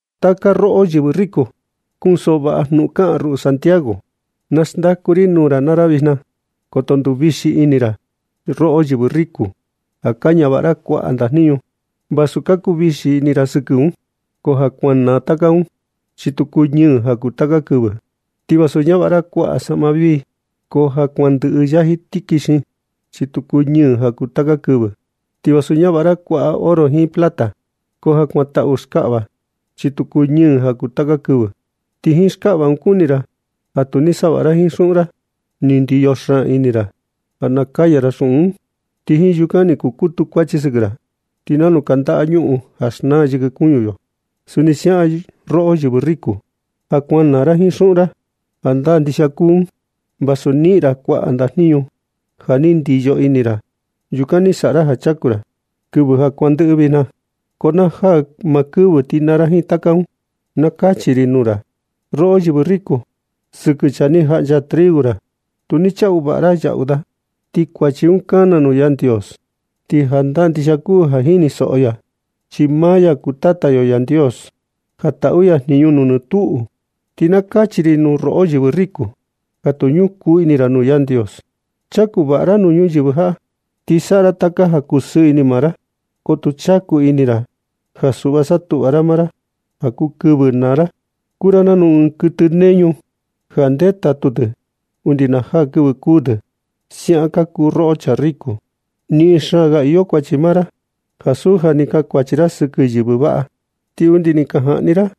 Taka roꞌo yɨvɨ riku, kunsoꞌo vaꞌa jnuꞌun kaꞌan ruꞌu Santiago, na xndaku ri nuu ra naa ra vijna. Koto nduvixi ini ra. Roꞌo yɨvɨ riku, ja ka ñavaꞌa ra kuaꞌa ndajniñu, vasu ka kuu vixi ini ra sɨkɨ un, ko ja kuan naa taka un, chi tu kuñɨ ja kuu taka kɨvɨ. Ti vasu ñavaꞌa ra kuaꞌa saꞌma vii, ko ja kuan ndɨꞌɨ yaji tikixin, chi tu kuñɨ ja kuu taka kɨvɨ. Ti vasu ñavaꞌa ra kuaꞌa oro jiin plata, ko ja kuan taꞌu skaꞌva, chi tu cuñɨ ja kuu taka kɨvɨ. Ti jiin skaꞌva un kuni ra ja tu ni saꞌa vaꞌa ra jiin xuꞌun ra. Ni ndiyo xaan ini ra ja nakaya ra xuꞌun un, ti jiin yukan ni kukutu kuachi sɨkɨ ra. Ti nanu kandaꞌa ñuꞌun ja xnaa yɨkɨ kuñu yo, suni siaꞌan roꞌo yɨvɨ riku, ja kuan naa ra jiin xuꞌun ra. Jandaa ndixia kuu un vasu ni niꞌin ra kuaꞌa ndajniñu ja ni ndiyo ini ra. Yukan ni saꞌa ra ja chaku ra kɨvɨ ja kuandɨꞌɨ vijna, ko na jaa maa kɨvɨ ti naa ra jiin taka un. Na kachi ri nuu ra, roꞌo yɨvɨ riku, sɨkɨ chaa ni jaꞌncha triu ra, tu ni chaꞌu vaꞌa ra yaꞌu da. Ti kuachi un kana nuu Yandios. Ti jandaa ndixia kuu ja jinisoꞌo ya un, chi maa ya kuu Tata yo Yandios ja taꞌu ya jniñu nuu nɨ tuꞌu. Ti na kachi ri nuu roꞌo yɨvɨ riku ja tu ñukoo ini ra nuu Yandios. Chaku vaꞌa ra nuu ñuyɨvɨ jaꞌa, ti saꞌa ra taka ja kusɨɨ ini maa ra. Ko tu chaku ini ra ja suꞌva satuꞌva ra maa ra ja kuu kɨvɨ naa ra. Kuu ra nanu ɨɨn kuɨtɨ neñu ja ndetatu tɨ undi na jaa kɨvɨ kuu tɨ, siaꞌan ka kuu roꞌo yɨvɨ riku. Niꞌin xaan ga iyo kuachi maa ra ansu ja ni kankuachi ra sɨkɨ yɨvɨ vaꞌa, ti undi ni ka jaꞌni ra i,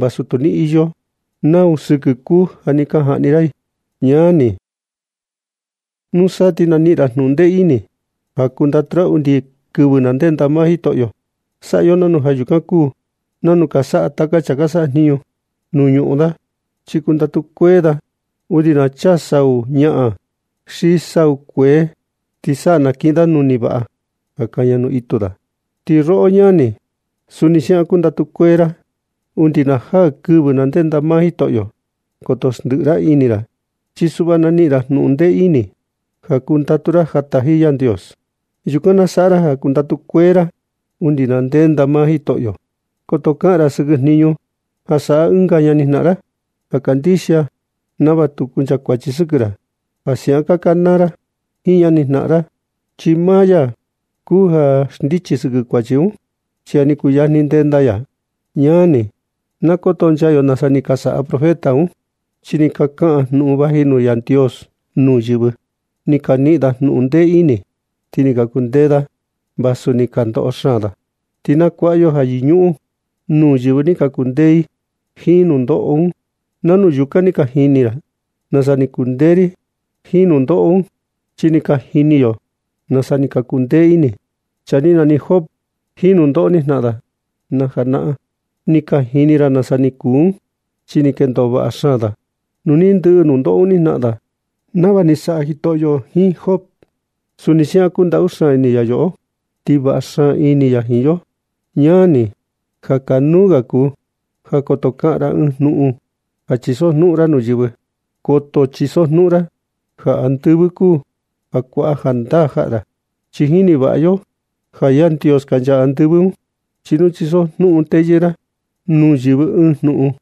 vasu tu ni iyo nau sɨkɨ kuu ja ni ka jaꞌni ra i. Ñani, nusa ti na niꞌin ra jnuꞌun ndee ini ja kundatu ra undi kɨvɨ na ndenda maa Jitoꞌo. Saꞌa yo nanu ja yukan kuu nanu ka saꞌa taka chaa ka sajniñu da nuu ñuꞌun da, chi kundatu kuee da undi na chaa sau ñaꞌan xi sau kuee, ti sa nakiꞌin da nuni vaꞌa ja kaña nuu itu da. Ti roꞌo ñani, suni siaꞌan kundatu kuee ra undi na jaa kɨvɨ ndenda maa Jitoꞌo. Koto xndiꞌi ra ini ra, chi suꞌva na niꞌin ra jnuꞌun ndee ini ja kundatu ra ja taji Yandios. Yukan na saꞌa ra ja kundatu kuee ra undi na ndenda maa Jitoꞌo. Koto kaꞌan ra sɨkɨ jniñu ja saꞌa ɨnga ñani jnaꞌan ra kandixia, nava tu kuncha kuachi sɨkɨ ra ja siaꞌan ka kanaa ra jiin ñani jnaꞌan ra. Chi maa ya kuu ja xndichi sɨkɨ kuachi un, chi ja ni kuyajni ndenda ya. Ñani, na kotonchaa yo nasa ni ka saꞌa profeta un, chaa ni ka kaꞌan jnuꞌun vaji nuu Yandios nuu yɨvɨ. Ni ka niꞌin da jnuꞌun ndee ini, ti ni ka kundee da vasu ni ka ndoꞌo xaan da. Ti na kuaꞌa yo ja yɨñuꞌun nuu yɨvɨ ni ka kundee i jiin nundoꞌo un. Nanu yukan ni ka jini ra nasa ni kundee i jiin nundoꞌo un. Chi ni ka jini yo nasa ni ka kundee ini chaa ni nani Job jiin nundoꞌo ni jnaꞌan da na janaꞌan. Ni ka jini ra nasa ni kuu un, chi ni kendo vaꞌa xaan da nu ni ndɨꞌɨ nundoꞌo un ni jnaꞌan da. Ti nava ni saꞌa Jitoꞌo jiin Job, suni siaꞌan kundaꞌu xaan ini ya yoꞌo, ti vaꞌa xaan ini ya jiin yo. Ñani, ja kanuu ga kuu ja koto kaꞌan ra ɨɨn jnuꞌun ja chisojnuꞌun ra nuu yɨvɨ. Koto chisojnuꞌun ra ja andɨvɨ kuu ja kuaꞌa jandaa jaꞌa ra, chi jini vaꞌa yo ja Yandios kancha andɨvɨ un. Ni tu chisojnuꞌun teyɨɨ ra nuu yɨvɨ ɨɨn jnuꞌun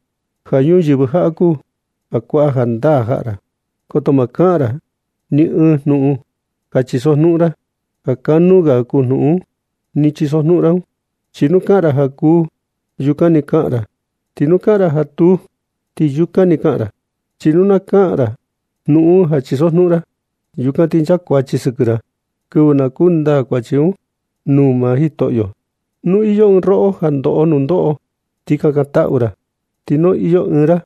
ja ñuyɨvɨ jaꞌa kuu ja kuaꞌa jandaa jaꞌa ra. Koto ma kaꞌan ra ni ɨɨn jnuꞌun ja chisojnuꞌun ra ja kanuu ga kuu jnuꞌun ni chisojnuꞌun ra un. Chi nu kaꞌan ra ja kuu, ti yukan ni kaꞌan ra. Ti nu kaꞌan ra ja tuu, ti yukan ni kaꞌan ra. Chi nu na kaꞌan ra jnuꞌun un ja chisojnuꞌun ra, yukan ti nchakuachi sɨkɨ ra kɨvɨ na kundaa kuachi un nuu maa Jitoꞌo. Nu iyo ɨɨn roꞌo ja ndoꞌo nundoꞌo, ti kakantaꞌu ra. Ti nu iyo ɨɨn ra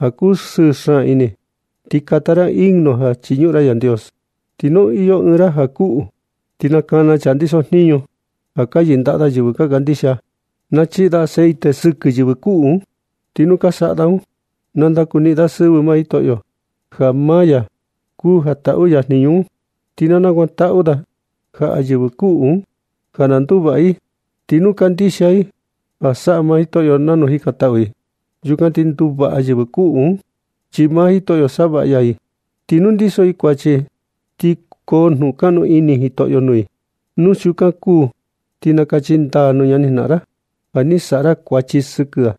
ja kusɨɨ xaan ini, ti na kata ra himno ja na chiñuꞌun ra Yandios. Ti nu iyo ɨɨn ra kuꞌu, ti na kana chaa ka ndiso jniñu ja ka yɨndaꞌa da yɨvɨ ka kandixia. Na chiꞌi da aceite sɨkɨ yɨvɨ kuꞌu un, ti nu ka saꞌa da un na ndakuniꞌin da sɨvɨ maa Jitoꞌo, ja maa ya kuu ja taꞌu ya jniñu un. Ti na kakantaꞌu da jaꞌa yɨvɨ kuꞌu un ja na nduvaꞌa i. Ti nu kandixia i ja saꞌa Jitoꞌo nava jikantaꞌu i, yukan ti nduvaꞌa yɨvɨ kuꞌu un, chi maa Jitoꞌo, nasavaꞌa ya i. Ti nu ndiso i kuachi, ti koo jnukaꞌnu ini Jitoꞌo nuu i. Nu siukan kuu ti nakachi ndaa nuu ñani jnaꞌan ra, ja ni saꞌa ra kuachi sɨkɨ da,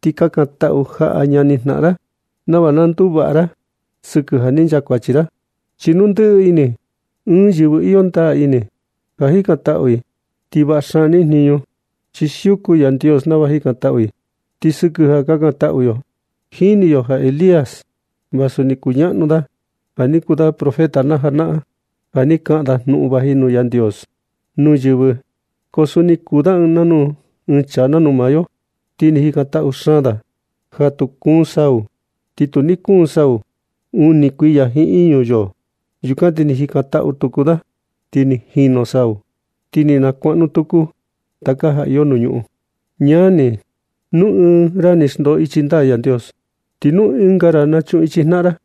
ti kakantaꞌu jaꞌa ñani jnaꞌan ra, nava na nduvaꞌa ra sɨkɨ ja ni nchakuachi ra. Chi nu ndɨꞌɨ ini ɨɨn yɨvɨ iyo ndaa ini ja jikantaꞌu i, ti vaꞌa xaan niꞌin jniñu, chi siuku Yandios nava jikantaꞌu i. Ti sɨkɨ ja kakantaꞌu yo, jini yo ja Elías, vasu ni kuñaꞌnu da ja ni kuu da profeta na janaꞌan, ja ni kaꞌan da jnuꞌun vaji nuu Yandios nuu yɨvɨ. Ko suni ni kuu da ɨɨn chaa nanu maa yo. Ti ni jikantaꞌu xaan da ja tu kuun sau, ti tu ni kuun sau uni kuiya jiin iñu yoo. Yukan ti ni jikantaꞌu tuku da, ti ni nchaa sau, ti ni nakuaꞌnu tuku taka ja iyo nuu ñuꞌun. Ñani, nu ɨɨn ra ni xndoo ichi ndaa Yandios, ti nu ɨnga ra nachuꞌun ichi jnaꞌan ra,